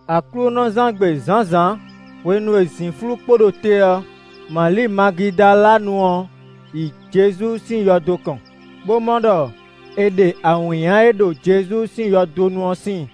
Aklúnɔzán gbe zǎnzǎn hwenu e zǐnflú kpo ɖo te ɔ́, Mali Magidalanu ɔ́ yi Jezu sín yɔdo kɔn, bó mɔ ɖɔ è ɖe awǐnnya e ɖo Jezu sín yɔdo nu ɔ́ síin.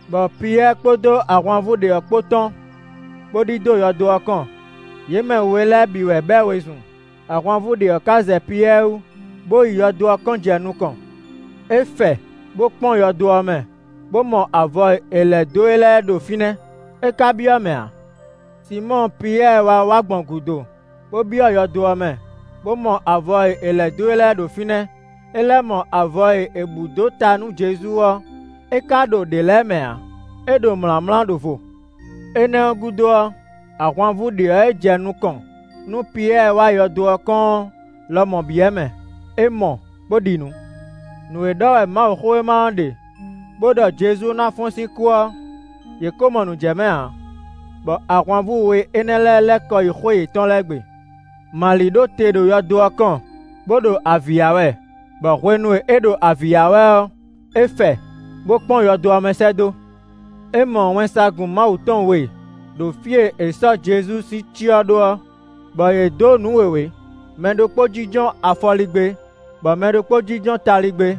Bɔ Piyɛ́ɛ kpódó ahwanvú ɖě ɔ́ kpó tɔ́n, bó ɖidó yɔdo ɔ́ kɔn. Yě mɛ we lɛ́ɛ bǐ wɛ bɛ́ wezun; ahwanvú ɖě ɔ́ ka zɛ Piyɛ́ɛ wú, bó yi yɔdo ɔ́ kɔn jɛ nukɔn. É fɛ, bó kpɔ́n yɔdo ɔ́ mɛ, bó mɔ avɔ e è lɛ̌ dó e lɛ́ɛ ɖo fínɛ́; é ka byɔ́ mɛ ǎ. Sinmɔ́ɔ Piyɛ́ɛ wá wá gbɔn gǔdo, bó byɔ́ yɔdo ɔ́ mɛ, bó mɔ avɔ e è lɛ̌ dó e lɛ́ɛ ɖo fínɛ́; é lɛ́ mɔ avɔ e è bǔ dó ta nú Jezu ɔ́; é ka ɖo ɖě lɛ́ɛ mɛ ǎ; é ɖo mlǎmlá ɖo vo. Énɛ́ ɔ́ gúdo ɔ́, ahwanvú ɖě ɔ́ e jɛ nukɔn nú Piyɛ́ɛ wá yɔdo ɔ́ kɔn ɔ́ lɔmɔ̌ byɔ́ mɛ; é mɔ bó ɖi nǔ. Nǔ e ɖɔ wɛ Mawuxówéma ɔ́ ɖe bó ɖɔ Jezu ná fɔ́n sín kú ɔ́, yě ko mɔ nǔ jɛ mɛ ǎ; bɔ ahwanvú we énɛ́ lɛ́ɛ lɛ́ kɔ yi xwé yětɔn lɛ́ɛ gbe. Mali ɖo te ɖo yɔdo ɔ́ kɔn, bó ɖo avǐ ya wɛ, bɔ hwenu e é ɖo avǐ ya wɛ ɔ́, é fɛ, bó kpɔ́n yɔdo ɔ́ mɛ sɛ́ dó. É mɔ wɛnsagun Mawu tɔn we ɖo fí e è sɔ́ Jezu sín cyɔ ɖó ɔ́, bɔ yě dǒ nǔ wěwé; mɛ ɖokpó jínjɔ́n afɔligbé, bɔ mɛ ɖokpó jínjɔ́n taligbé;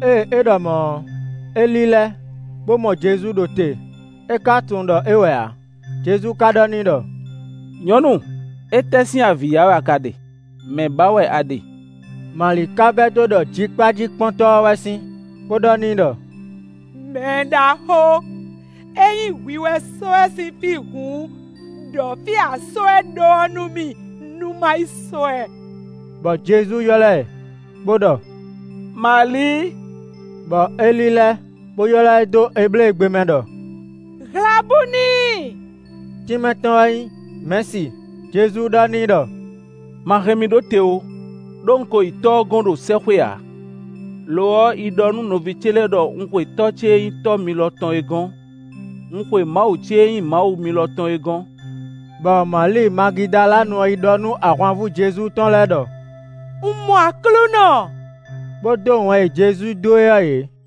Ée é ɖɔ mɔ̌ ɔ́, é lílɛ́, bó mɔ Jezu ɖo te; é ka tunwun ɖɔ é wɛ ǎ. Jezu ka ɖɔ n'i ɖɔ: “Nyɔ̌nu! Étɛ́ sín avǐ ya wɛ a ka ɖe? Mɛ̌ ba wɛ a ɖe?” Mali ka vɛdó ɖɔ jikpájíkpɔ́ntɔ́ ɔ́ wɛ sín, bó ɖɔ n'i ɖɔ: “Mɛɖaxó! Ényí hwi wɛ sɔ́ ɛ sín fí hǔn, ɖɔ fí e a sɔ́ ɛ ɖó ɔ́ nú mì, nú má yi sɔ́ ɛ.” Bɔ Jezu ylɔ́ ɛ bó ɖɔ: “Mali!” Bɔ é lílɛ́, bó ylɔ́ ɛ dó Ebléegbe mɛ ɖɔ: “Hlabúni”; (tínmɛ tɔn wɛ nyí Mɛ̌si.) Jezu ɖɔ n'i ɖɔ: “Ma hɛn mì ɖó te ó, ɖó un ko yi Tɔ́ ɔ́ gɔ́n ɖo sɛ́xwé ǎ; lo ɔ́, yi ɖɔ nú nɔví ce lɛ́ɛ ɖɔ un xwe Tɔ́ ce e nyí Tɔ́ mi lɔ tɔn é gɔ́n; un xwe Mawu ce e nyí Mawu mi lɔ tɔn é gɔ́n.” Bɔ Mali Magidalanu ɔ́ yi ɖɔ nú ahwanvú Jezu tɔn lɛ́ɛ ɖɔ: “Un mɔ Aklúnɔ!” Bó dó wɛn e Jezu dó e ɔ́ yě.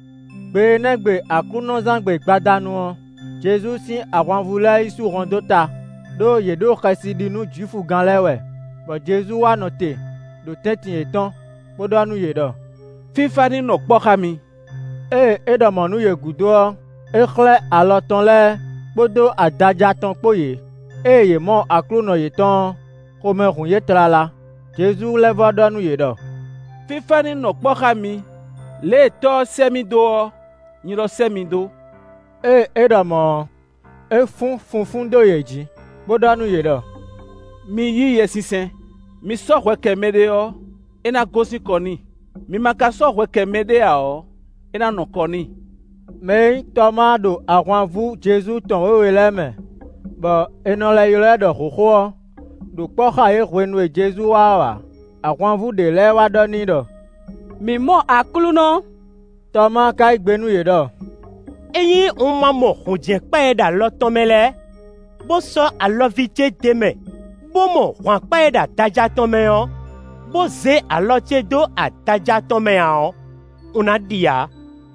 Gbe énɛ́ gbe aklúnɔzán gbe gbadanu ɔ́, Jezu sín ahwanvú lɛ́ɛ yi sú hɔn dó ta; ɖó yě ɖo xɛsi ɖi nú Jwifugán lɛ́ɛ wɛ, bɔ Jezu wá nɔ te, ɖo tɛ́ntin yětɔn, bó ɖɔ nú yě ɖɔ: “Fífá ní nɔ kpɔ́ xá mi!” Ée é ɖɔ mɔ̌ nú yě gúdo ɔ́, é xlɛ́ alɔ tɔn lɛ́ɛ kpódó adaja tɔn kpó yě. Ée yě mɔ Aklúnɔ yětɔn ɔ́, xomɛ hun yě tlala. Jezu lɛ́ vɔ́ ɖɔ nú yě ɖɔ: “Fífá ní nɔ kpɔ́ xá mi. Lě e Tɔ́ ɔ́ sɛ́ mì dó ɔ́, nyi lɔ sɛ́ mi dó.” Ée é ɖɔ mɔ̌ ɔ́, é fún funfún dó yě jí, bó ɖɔ nú yě ɖɔ: “Mi yí Yɛsinsɛn. Mi sɔ́ hwɛ kɛ mɛɖé ɔ́, é ná gosín kɔ n'i; mi ma ka sɔ́ hwɛ kɛ mɛɖé ǎ ɔ́, é ná nɔ kɔ n'i.” Mɛ e nyí Tɔmáa ɖo ahwanvú Jezu tɔn wěwe lɛ́ɛ mɛ bɔ è nɔ lɛ́ ylɔ́ ɛ ɖɔ hǒxo ɔ́ ɖo kpɔ́ xá yě hwenu e Jezu wá ɔ́ ǎ. Ahwanvú ɖě lɛ́ɛ wá ɖɔ n'i ɖɔ: “Mǐ mɔ Aklúnɔ!” Tɔmáa ka yí gbe nú yě ɖɔ: “Ényí un ma mɔ hǔnjɛ́nkpa e ɖo alɔ tɔn mɛ lɛ́ɛ, bó sɔ́ alɔví ce d'é mɛ, bó mɔ hwǎnkpa e ɖo adaja tɔn mɛ ɔ́, bó zé alɔ ce dó adaja tɔn mɛ ǎ ɔ́, un ná ɖi ǎ.”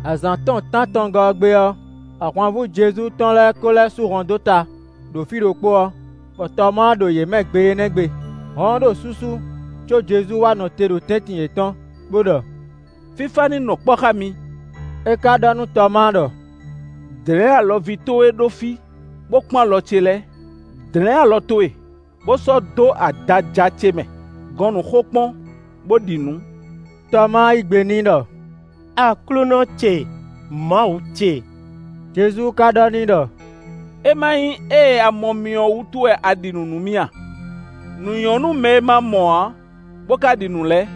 Azǎn tɔn tántɔngɔ́ ɔ́ gbe ɔ́, ahwanvú Jezu tɔn lɛ́ɛ ko lɛ́ sú hɔn dó ta, ɖo fí ɖokpó ɔ́, bɔ Tɔmáa ɖo yě mɛ gbe énɛ́ gbe. Hɔn ɔ́ ɖo súsú có Jezu wá nɔ te ɖo tɛ́ntin yětɔn, bó ɖɔ: “Fífá ní nɔ kpɔ́ xá mi.” É ka ɖɔ nú Tɔmáa ɖɔ: “Dlɛ̌n alɔví towe ɖó fí, bó kpɔ́n alɔ ce lɛ́ɛ. Dlɛ̌n alɔ towe, bó sɔ́ dó adaja ce mɛ; gɔn nǔ xokpɔ́n, bó ɖi nǔ.” Tɔmáa yí gbe n'i ɖɔ: “Aklúnɔ ce, Mawu ce!” Jezu ka ɖɔ n'i ɖɔ: “É ma nyí ée a mɔ mì ɔ́ wútu wɛ a ɖi nǔ nú mì a? Nǔ nyɔ́ nú mɛ e ma mɔ ǎ, bó ka ɖi nǔ lɛ́ɛ.”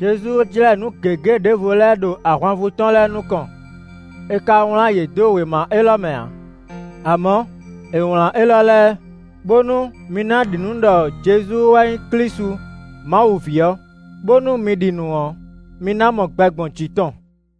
Jezu jlɛ́ nǔ gěgé ɖěvo lɛ́ɛ ɖo ahwanvú tɔn lɛ́ɛ nukɔn; è ka wlán yě dó wěma élɔ́ mɛ ǎ. Amɔ̌, è wlǎn élɔ́ lɛ́ɛ, bónú mi ná ɖi nǔ ɖɔ Jezu wɛ nyí Klísu Mawu ví ɔ́, bónú mi ɖi nǔ ɔ́, mi ná mɔ gbɛ gbɔn jǐ tɔn.